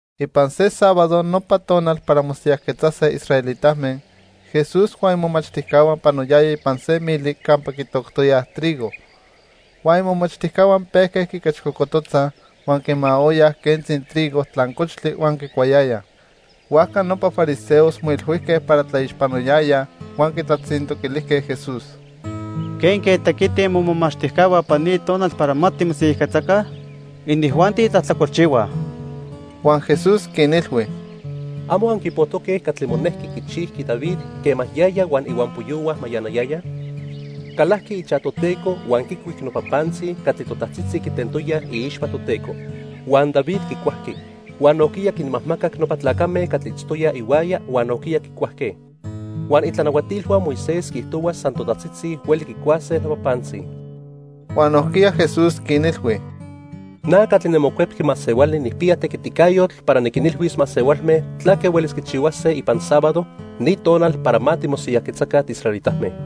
Ipan se sábado, nopa tonal para mosiyajquetzase israelitame, Jesús huan imomachtijcahua panoyayaj ipan se mili campa quitoctoyaj trigo. Huan imomachtijcahua pejque quiquechcocototzaj, huan quimaoyaj quentzi trigo tlancochtli huan quicuayayaj. Huajca nopa fariseos moilhuijque para tlaixpanoyayaj huan quitlatzintoquilijque Jesús: —¿Quenque tequitij momomachtijcahua ipan ni tonal para ma timosiyajquetzaca? Inijuanti tlajtlacolchihuaj. Huan Jesús quinilhui: —¿Amo anquipojtoque catli monejqui quichijqui David quema yaya huan ihuampoyohua mayanayayaj? Calajqui ichaj Toteco huan quicuic nopa pantzi catli totajtzitzi quitentoyaj iixpa Toteco. Huan David quicuajqui, huan nojquiya quinmajmacac nopa tlacame catli itztoyaj ihuaya huan nojquiya quicuajque. Huan itlanahuatilhua Moisés quiijtohua san totajtzitzi hueli quicuase nopa pantzi. Huan nojquiya Jesús quinilhui: —Na catli niMocuepqui Masehuali nijpiya tequiticayotl para niquinilhuis masehualme tlaque huelis quichihuase ipan sábado, ni tonal para ma timosiyajquetzaca tiisraelitame.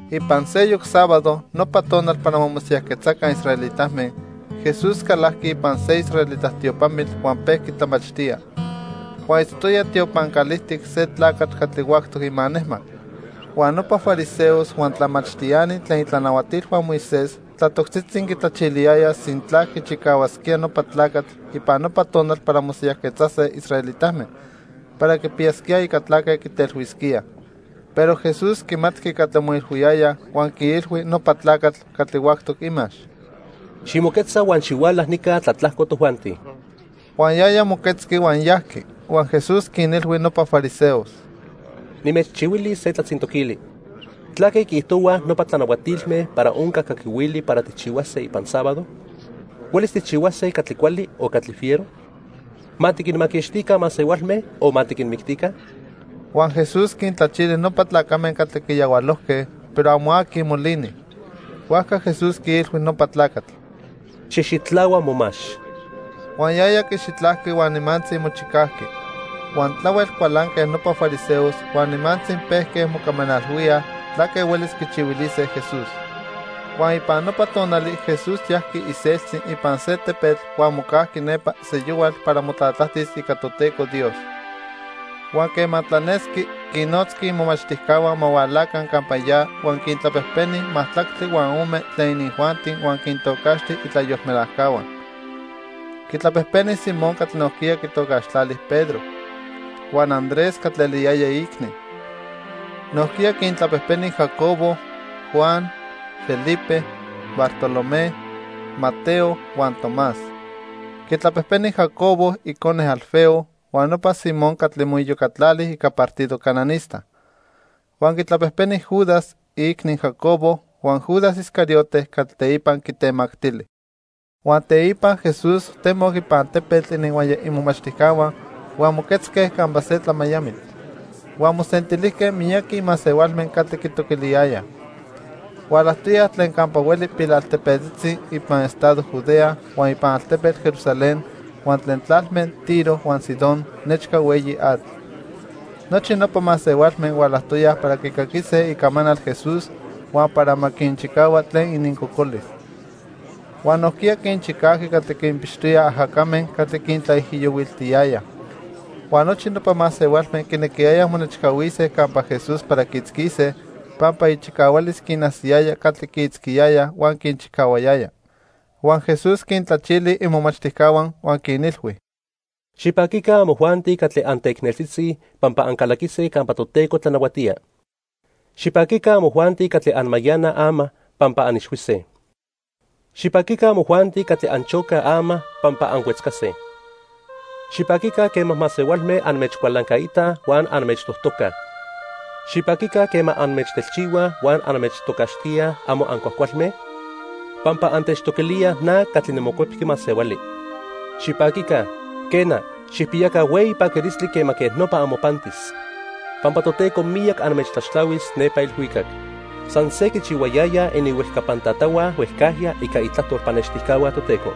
Ipan seyoc sábado, nopa tonal para ma mosiyajquetzaca israelitame, Jesús calajqui ipan se israelita tiopamitl huan pejqui tlamachtía. Huan itztoya tiopan calijtic se tlacatl catli huactoc imanejmac. Huan nopa fariseos huan tlamachtiani tlen itlanahuatilhua Moisés tlatoctzitzi quitlachiliyayaj sintla quichicahuasquía nopa tlacatl ipan nopa tonal para mosiyajquetzase israelitame para quipiyasquíaj ica tlaque quitelhuisquíaj. Pero Jesús quimatqui catli moilhuiyayaj huan quiilhui nopa tlacatl catli huactoc imax: —Ximoquetza huan xihuala nica tlatlajco tojuanti. Huan yaya moquetzqui huan yajqui. Huan Jesús quinilhui nopa fariseos: —Nimechchihuilis se tlatzintoquili: ¿Tlaque quiijtohuaj nopa tlanahuatilme para onca caquihuili para tijchihuase ipan sábado? ¿Huelis tijchihuase catli cuali o catli fiero? ¿Ma tiquinmaquixtica masehualme o ma tiquinmictica? Huan Jesús quintlachili nopa tlacame catli quiyahualojque, pero amo aqui molini. Huajca Jesús quiilhui nopa tlacatl: —Xijxitlahua momax. Huan yaya quixitlajqui huan nimantzi mochicajqui. Huan tlahuel cualanque nopa fariseos huan nimantzi pejque mocamanalhuíaj tlaque huelis quichihuilise Jesús. Huan ipan nopa tonali Jesús yajqui iseltzi ipan se tepetl huan mocajqui nepa seyohual para motlatlajtis ica Toteco Dios. Huan quema tlanesqui, quinnotzqui imomachtijcahua ma hualaca campa ya huan quintlapejpeni majtlactli huan ome tlen inijuanti huan quintocaxti itlayolmelajcahua. Quitlapejpeni Simón catli nojquiya quitocaxtlali Pedro, huan Andrés catli eliyaya iicni. Nojquiya quintlapejpeni Jacobo, Juan, Felipe, Bartolomé, Mateo huan Tomás. Quitlapejpeni Jacobo icone Alfeo huan nopa Simón catli moiyocatlali ica partido cananista. Huan quitlapejpeni Judas, iicni Jacobo huan Judas Iscariote catli teipa quitemactili. Huan teipa Jesús temoc ipan tepetl ininhuaya imomachtijcahua huan moquetzque campa se tlamayamitl. Huan mosentilijque miyaqui masehualme catli quitoquiliyayaj. Hualajtoyaj tlen campa hueli pilaltepetzitzi ipan estado Judea, huan ipan altepetl Jerusalén huan tlen tlalme Tiro huan Sidón nechca hueyi atl. Nochi nopa masehualme hualajtoyaj para quicaquise icamanal Jesús huan para ma quinchicahua tlen inincocolis. Huan nojquiya quinchicajqui catli quinpixtoyaj ajacame catli quintlaijiyohuiltiyayaj. Huan nochi nopa masehualme quinequiyayaj monechcahuise campa Jesús para quiitzquise, pampa ichicahualis quinajsiyaya catli quiitzquiyayaj huan quinchicahuayaya. Huan Jesús quintlachili imomachtijcahua huan quinilhui: "Xipaquica amojuanti catli anteicneltzitzi, pampa ancalaquise campa Toteco tlanahuatía. Xipaquica amojuanti catli anmayanaj ama, pampa anixhuise. Xipaquica amojuanti catli anchocaj ama, pampa anhuetzcase. Xipaquica quema masehualme anmechcualancaitaj huan anmechtojtocaj. Xipaquica quema anmechtelchihuaj huan anmechtocaxtíaj amo ancuajcualme, pampa antechtoquilíaj na catli niMocuepqui Masehuali. Xipaquica, quena, xijpiyaca hueyi paquilistli quema quej nopa amopantis, pampa Toteco miyac anmechtlaxtlahuis nepa ilhuicac. San se quichihuayayaj ininhuejcapan tatahua huejcajya ica itlajtol pannextijcahua Toteco.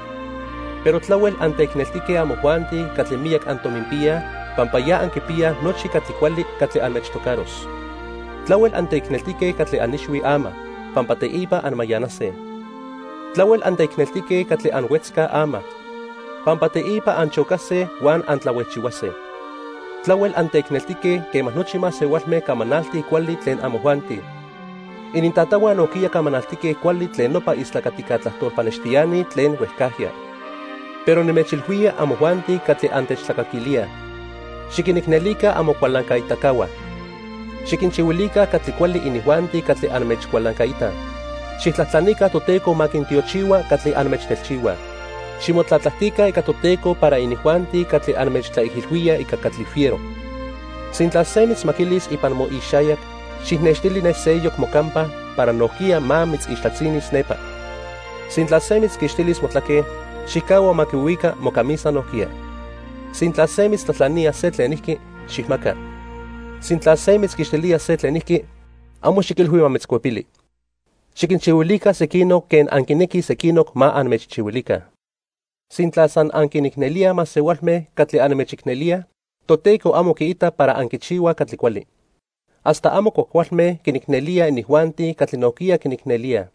Pero tlahuel anteicneltique amojuanti catli miyac antominpiyaj, pampa ya anquipiyaj nochi catli cuali catli anmechtocaros. Tlahuel anteicneltique catli anixhuij ama, pampa teipa anmayanase. Tlahuel anteicneltique catli anhuetzcaj ama, pampa teipa anchocase huan antlahuejchihuase. Tlahuel anteicneltique quema nochi masehualme camanaltij cuali tlen amojuanti. Inintatahua nojquiya camanaltique cuali tlen nopa istlacatica tlajtol pannextiani tlen huejcajya. "Pero nimechilhuía amojuanti catli antechtlacaquilíaj: Xiquinicnelica amocualancaitacahua. Xiquinchihuilica catli cuali inijuanti catli anmechcualancaitaj. Xijtlajtlanica Toteco ma quintiochihua catli anmechtelchihuaj. Ximotlatlajtica ica Toteco para inijuanti catli anmechtlaijilhuíaj ica catli fiero. Sintla se mitzmaquilis ipan moixayac, xijnextili ne seyoc mocampa para nojquiya ma mitzmaquilis nepa. Sintla se mitzquixtilis motlaque, xijcahua ma quihuica mocamisa nojquiya. Sintla se mitztlajtlanía se tlenijqui, xijmaca. Sintla se mitzquixtilía se tlenijqui, amo xiquilhui ma mitzcuepili. Xiquinchihuilica sequinoc quen anquinequij sequinoc ma anmechchihuilica. "Sintla san anquinicnelíaj masehualme catli anmechicnelíaj, Toteco amo quiita para anquichihuaj catli cuali. Hasta amo cuajcualme quinicnelíaj inijuanti catli nojquiya quinicnelíaj.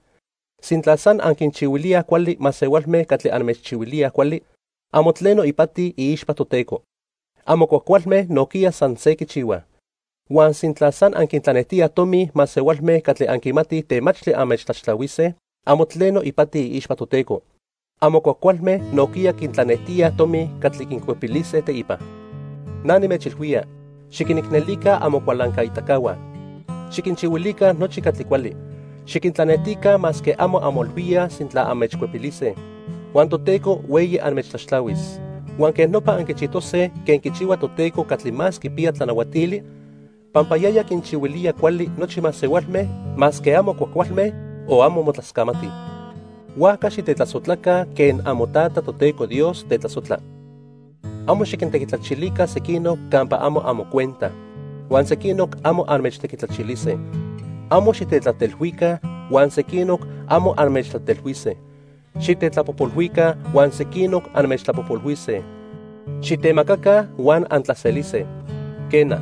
Sintla san anquinchihuilíaj cuali masehualme catli anmechchihuilíaj cuali, amo tleno ipati iixpa Toteco. Amo cuajcualme nojquiya san se quichihuaj. Huan sintla san anquintlanejtíaj tomi masehualme catli anquimatij temachtli anmechtlaxtlahuise, amo tleno ipati iixpa Toteco. Amo cuajcualme nojquiya quintlanejtíaj tomi catli quincuepilise teipa. Na nimechilhuía, xiquinicnelica amocualancaitacahua. Xiquinchihuilica nochi catli cuali. Xiquintlanejtica masque amo anmoilhuíaj sintla anmechcuepilise. Huan Toteco hueyi anmechtlaxtlahuis. Huan quej nopa anquichijtose quen quichihua Toteco Catli Más Quipiya Tlanahuatili, pampa yaya quinchihuilía cuali nochi masehualme, masque amo cuajcualme o amo motlascamatij. Huajca xitetlasojtlaca quen amoTata, Toteco Dios, tetlasojtla. "Amo xiquintequitlachilica sequinoc campa amo amocuenta, huan sequinoc amo anmechtequitlachilise. Amo xitetlatelhuica, huan sequinoc amo anmechtlatelhuise. Xitetlapojpolhuica, huan sequinoc anmechtlapojpolhuise. Xitemacaca huan antlaselise. Quena,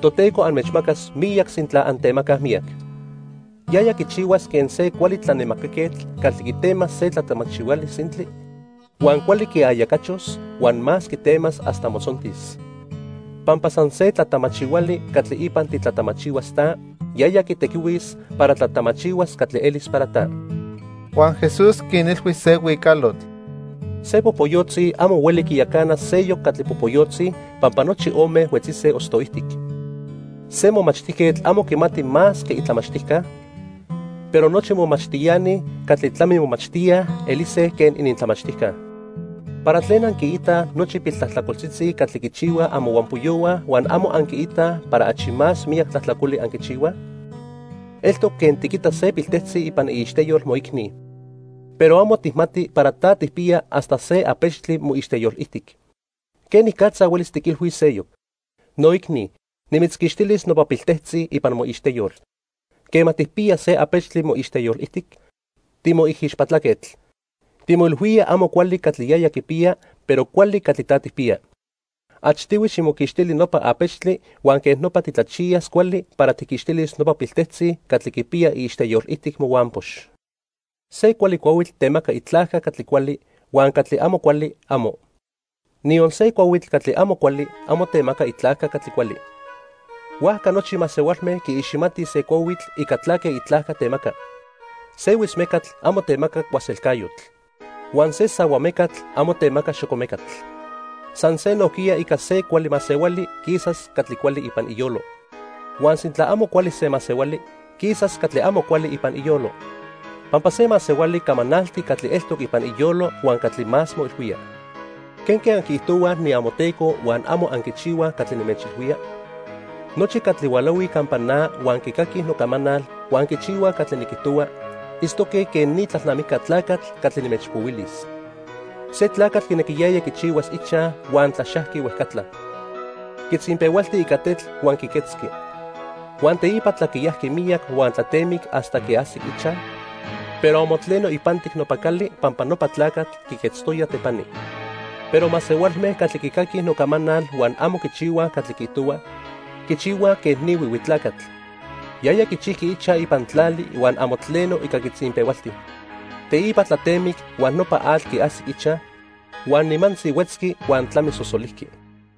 Toteco anmechmacas miyac sintla antemacaj miyac. Yaya quichihuas quen se cuali tlanemacaquetl catli quitemas se tlatamachihuali sintli, huan cuali quiayacachos, huan más quitemas hasta motzontis. Pampa san se tlatamachihuali catli ipan titlatamachihuas ta, yaya quitequihuis para tlatamachihuas catli elis para ta." Huan Jesús quinilhui se huicalotl: "Se popoyotzi amo hueli quiyacana seyoc catli popoyotzi, pampa nochi ome huetzise ostoijtic. Se momachtijquetl amo quimati más que itlamachtijca, pero nochi momachtiani catli tlamimomachtíaj elise quen inintlamachtijca. "¿Para tlen anquiitaj nochi piltlajtlacoltzitzi catli quichihuaj amohuampoyohua huan amo anquimatij para achi más miyac tlajtlacoli anquichihuaj? Eltoc quen tiquita se piltejtzi ipan iixteyol moicni, pero amo tijmati para ta tijpiya hasta se apechtli moixteyolijtic. ¿Quenicatza huelis tiquilhuis seyoc: 'Noicni, nimitzquixtilis nopa piltejtzi ipan moixteyol', quema tijpiya se apechtli moixteyolijtic? Timoijixpatlaquetl. Timoilhuía amo cuali catli yaya quipiya, pero cuali catli ta tijpiya. Achtihui ximoquixtili nopa apechtli huan quej nopa titlachiyas cuali para tijquixtilis nopa piltejtzi catli quipiya iixteyolijtic mohuampox. "Se cuali cuahuitl temaca itlajca catli cuali, huan catli amo cuali, amo. Niyon se cuahuitl catli amo cuali amo temaca itlajca catli cuali. Huajca nochi masehualme quiiximatij se cuahuitl ica tlaque itlajca temaca. Se huitzmecatl amo temaca cuaselcayotl. Huan se sahua mecatl amo temaca xocomecatl. San se nojquiya ica se cuali masehuali, quisas catli cuali ipan iyolo. Huan sintla amo cuali se masehuali, quisas catli amo cuali ipan iyolo. Pampa se masehuali camanalti catli eltoc ipan iyolo huan catli más moilhuía. "¿Quenque anquiijtohuaj niamoTeco huan amo anquichihuaj catli nimechilhuía? Nochi catli hualahuij campa na huan quicaquij nocamanal huan quichihuaj catli niquijtohua, itztoque quen ni tlalnamijca tlacatl catli nimechpohuilis. Se tlacatl quinequiyaya quichihuas ichaj huan tlaxajqui huejcatla. Quitzinpehualti ica tetl huan quiquetzqui. Huan teipa tlaquiyajqui miyac huan tlatemic hasta quiajsic ichaj, pero amo tleno ipantic nopa cali pampa nopa tlacatl quiquetztoya tepani. Pero masehualme catli quicaquij nocamanal huan amo quichihuaj catli quiijtohua, quichihuaj quej ni huihui tlacatl. Yaya quichijqui ichaj ipan tlali huan amo tleno ica quitzinpehualti. Teipa tlatemic, huan nopa atl quiajsic ichaj, huan nimantzi huetzqui huan tlamisosolijqui."